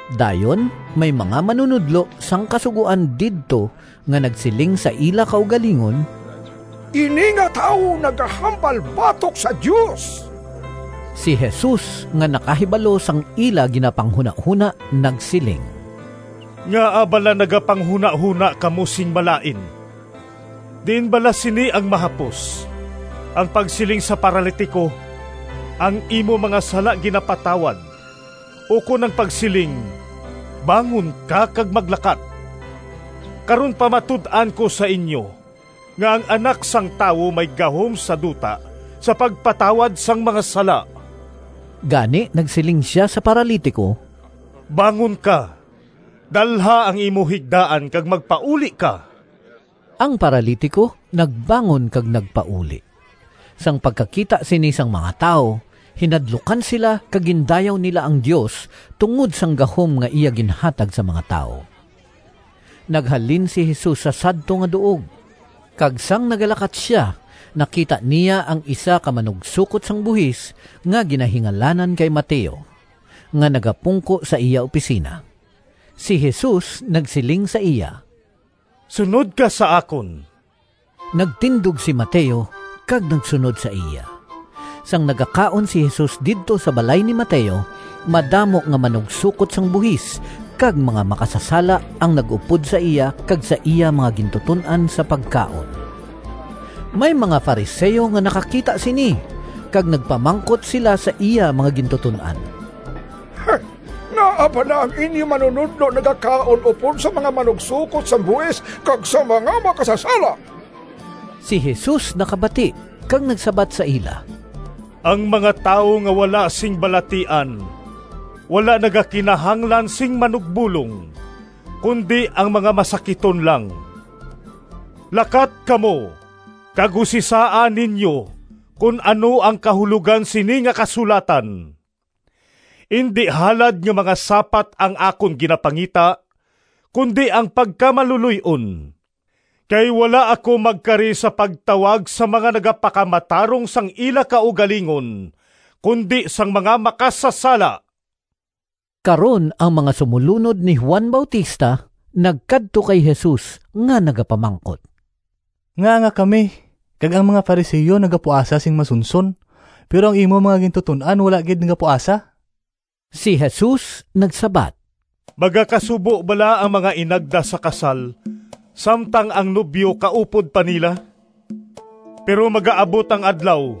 Dayon may mga manunodlo sang Kasugoan didto nga nagsiling sa ila kaugalingon, “Ini nga tawo nagahambal batok sa Dios!” Si Jesus nga nakahibalo sang ila ginapanghunahona nagsiling, “Ngaa bala nagapanghunahona kamo sing malain? Diin bala sini ang mahapos, ang pagsiling sa paralitiko, ‘Ang imo mga sala ginapatawad,’ ukon ang pagsiling, ‘Bangon ka kag maglakat’? Karon pamatud-an ko sa inyo nga ang Anak sang Tawo may gahom sa duta sa pagpatawad sang mga sala.” Gani nagsiling sia sa paralitiko, “Bangon ka, dalha ang imo higdaan kag magpauli ka!” Ang paralitiko nagbangon kag nagpauli. Sang pagkakita sini sang mga tawo, hinadlukan sila kag gindayaw nila ang Dios tungod sang gahom nga iya ginhatag sa mga tawo. Naghalin si Jesus sa sadto nga duog, kag sang nagalakat sia nakita niya ang isa ka manugsokot sang buhis nga ginahingalanan kay Mateo nga nagapungko sa iya opisina. Si Jesus nagsiling sa iya, “Sunod ka sa akon.” Nagtindog si Mateo kag nagsunod sa iya. Sang nagakaon si Jesus didto sa balay ni Mateo, madamo nga mga manugsokot sang buhis kag mga makasasala ang nag-upod sa iya kag sa iya mga gintuton-an sa pagkaon. May mga Fariseo nga nakakita sini kag nagpamangkot sila sa iya mga gintuton-an, “Ngaa bala ang inyo manunodlo nagakaon upod sa mga manugsokot sang buhis kag sa mga makasasala?” Si Jesus nakabati kag nagsabat sa ila, “Ang mga tawo nga wala sing balatian wala nagakinahanglan sing manugbolong, kundi ang mga masakiton lang. Lakat kamo kag usisaa ninyo kon ano ang kahulogan sini nga kasulatan: ‘Indi halad nga mga sapat ang akon ginapangita, kundi ang pagkamaluloy-on.’ Kay wala ako magkari sa pagtawag sang mga nagapakamatarong sang ila kaugalingon kundi sang mga makasasala.” Karon ang mga sumolunod ni Juan Bautista nagkadto kay Jesus nga nagapamangkot, “Ngaa nga kami kag ang mga Fariseo nagapuasa sing masunson, pero ang imo mga gintuton-an wala gid nagapuasa?” Si Jesus nagsabat, “Magakasubo bala ang mga inagda sa kasal samtang ang nobyo kaupod pa nila? Pero magaabot ang adlaw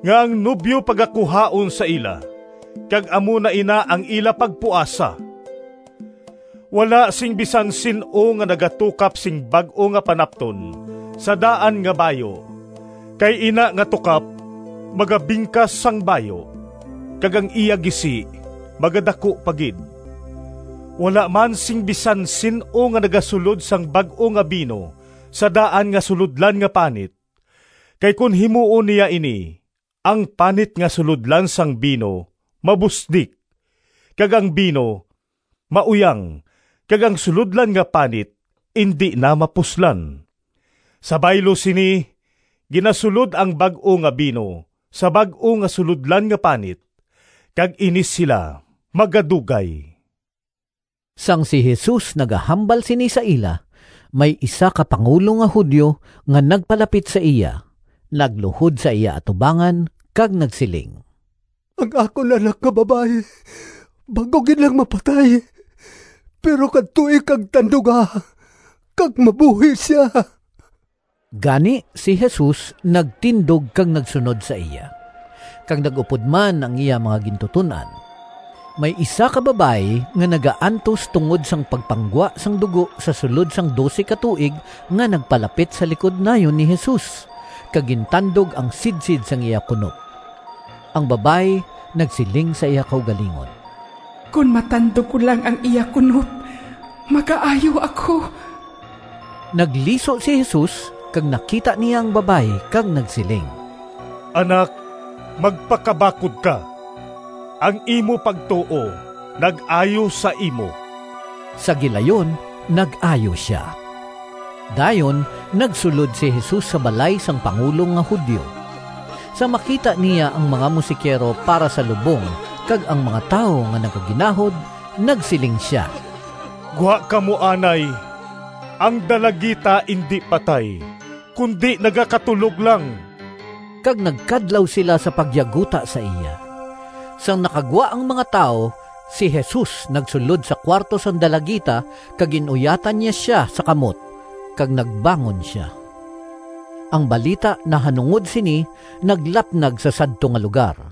nga ang nobyo pagakuhaon sa ila kag amo na ina ang ila pagpuasa. “Wala sing bisan sin-o nga nagatukap sing bag-o nga panapton sa daan nga bayu kay ina nga tukap magabingkas sang bayu, kag ang iya gisi magadaku pa gid. Wala man sing bisan sin-o nga nagasulod sang bag-o nga bino sa daan nga sulodlan nga panit, kay kon himuon niya ini ang panit nga sulodlan sang bino mabusdik, kag ang bino mauyang kag ang sulodlan nga panit indi na mapuslan. Sa baylo sini, ginasulod ang bag-o nga bino sa bag-o nga sulodlan nga panit, kag ini sila magadugay.” Sang si Jesus nagahambal sini sa ila, may isa ka pangulo nga Judio nga nagpalapit sa iya, nagluhod sa iya atubangan kag nagsiling, “Ang akon anak nga babayi bag-o gid lang mapatay, pero kadtoi kag tanduga kag mabuhi sia.” Gani si Jesus nagtindog kag nagsunod sa iya, kag nag-upod man ang iya mga gintuton-an. May isa ka babayi nga nagaantos tungod sang pagpanggwa sang dugo sa sulod sang dose ka tuig nga nagpalapit sa likod nayon ni Jesus kag gintandog ang sidsid sang iya kunop. Ang babayi nagsiling sa iya kaugalingon, “Kon matandog ko lang ang iya kunop magaayo ako.” Nagliso si Jesus kag nakita niya ang babayi kag nagsiling, “Anak magpakabakod ka! Ang imo pagtuo nag-ayo sa imo.” Sa gilayon nag-ayo sia. Dayon nagsulod si Jesus sa balay sang pangulo nga Judio. Sang makita niya ang mga musikero para sa lubong kag ang mga tawo nga nagaginahod, nagsiling sia, “Gwa kamo anay! Ang dalagita indi patay, kundi nagakatulog lang!” Kag nagkadlaw sila sa pagyaguta sa iya. Sang nakagwa ang mga tawo, si Jesus nagsulod sa kuwarto sang dalagita kag gin-uyatan niya sia sa kamot, kag nagbangon sia. Ang balita nahanungod sini naglapnag sa sadto nga lugar.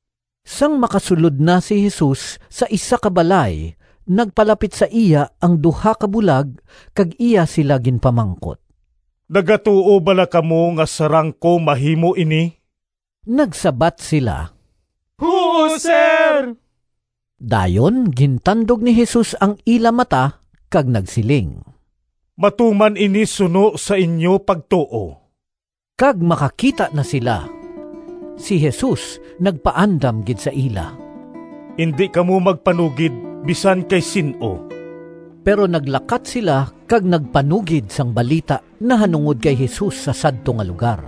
Sang makasulod na si Jesus sa isa ka balay nagpalapit sa iya ang duha ka bulag kag iya sila ginpamangkot, “Nagatuo bala kamo nga sarang ko mahimo ini?” Nagsabat sila, “Huo, Sir!” Dayon gintandog ni Jesus ang ila mata kag nagsiling, “Matuman ini suno sa inyo pagtuo!” Kag makakita na sila. Si Jesus nagpaandam gid sa ila, “Indi kamo magpanugid bisan kay sin-o!” Pero naglakat sila kag nagpanugid sang balita nahanungod kay Jesus sa sadto nga lugar.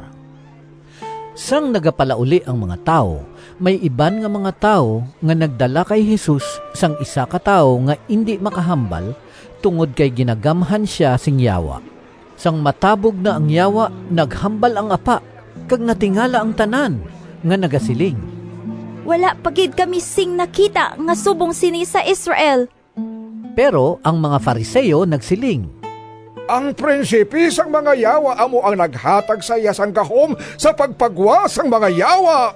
Sang nagapalauli ang mga tawo, may iban nga mga tawo nga nagdala kay Jesus sang isa ka tawo nga indi makahambal tungod kay ginagamhan sia sing yawa. Sang matabog na ang yawa naghambal ang apa kag natingala ang tanan nga nagasiling, “Wala pa gid kami sing nakita nga subong sini sa Israel!” Pero ang mga Fariseo nagsiling, “Ang prinsipe sang mga yawa amo ang naghatag sa iya sang gahom sa pagpagwa sang mga yawa.”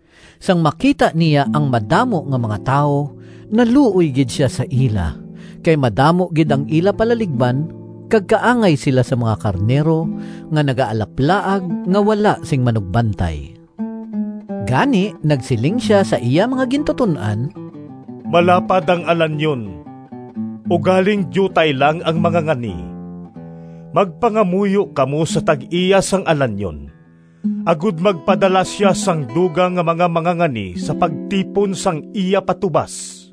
Sang makita niya ang madamo nga mga tawo, naluoy gid sia sa ila kay madamo gid ang ila palaligban kag kaangay sila sang mga karnero nga nagaalaplaag nga wala sing manugbantay. Gani nagsiling sia sa iya mga gintuton-an, “Malapad ang alanyon, ugaling diutay lang ang mangangani. Magpangamuyo kamo sa tag-iya sang alanyon, agod magpadala sia sang dugang nga mga mangangani sa pagtipon sang iya patubas.”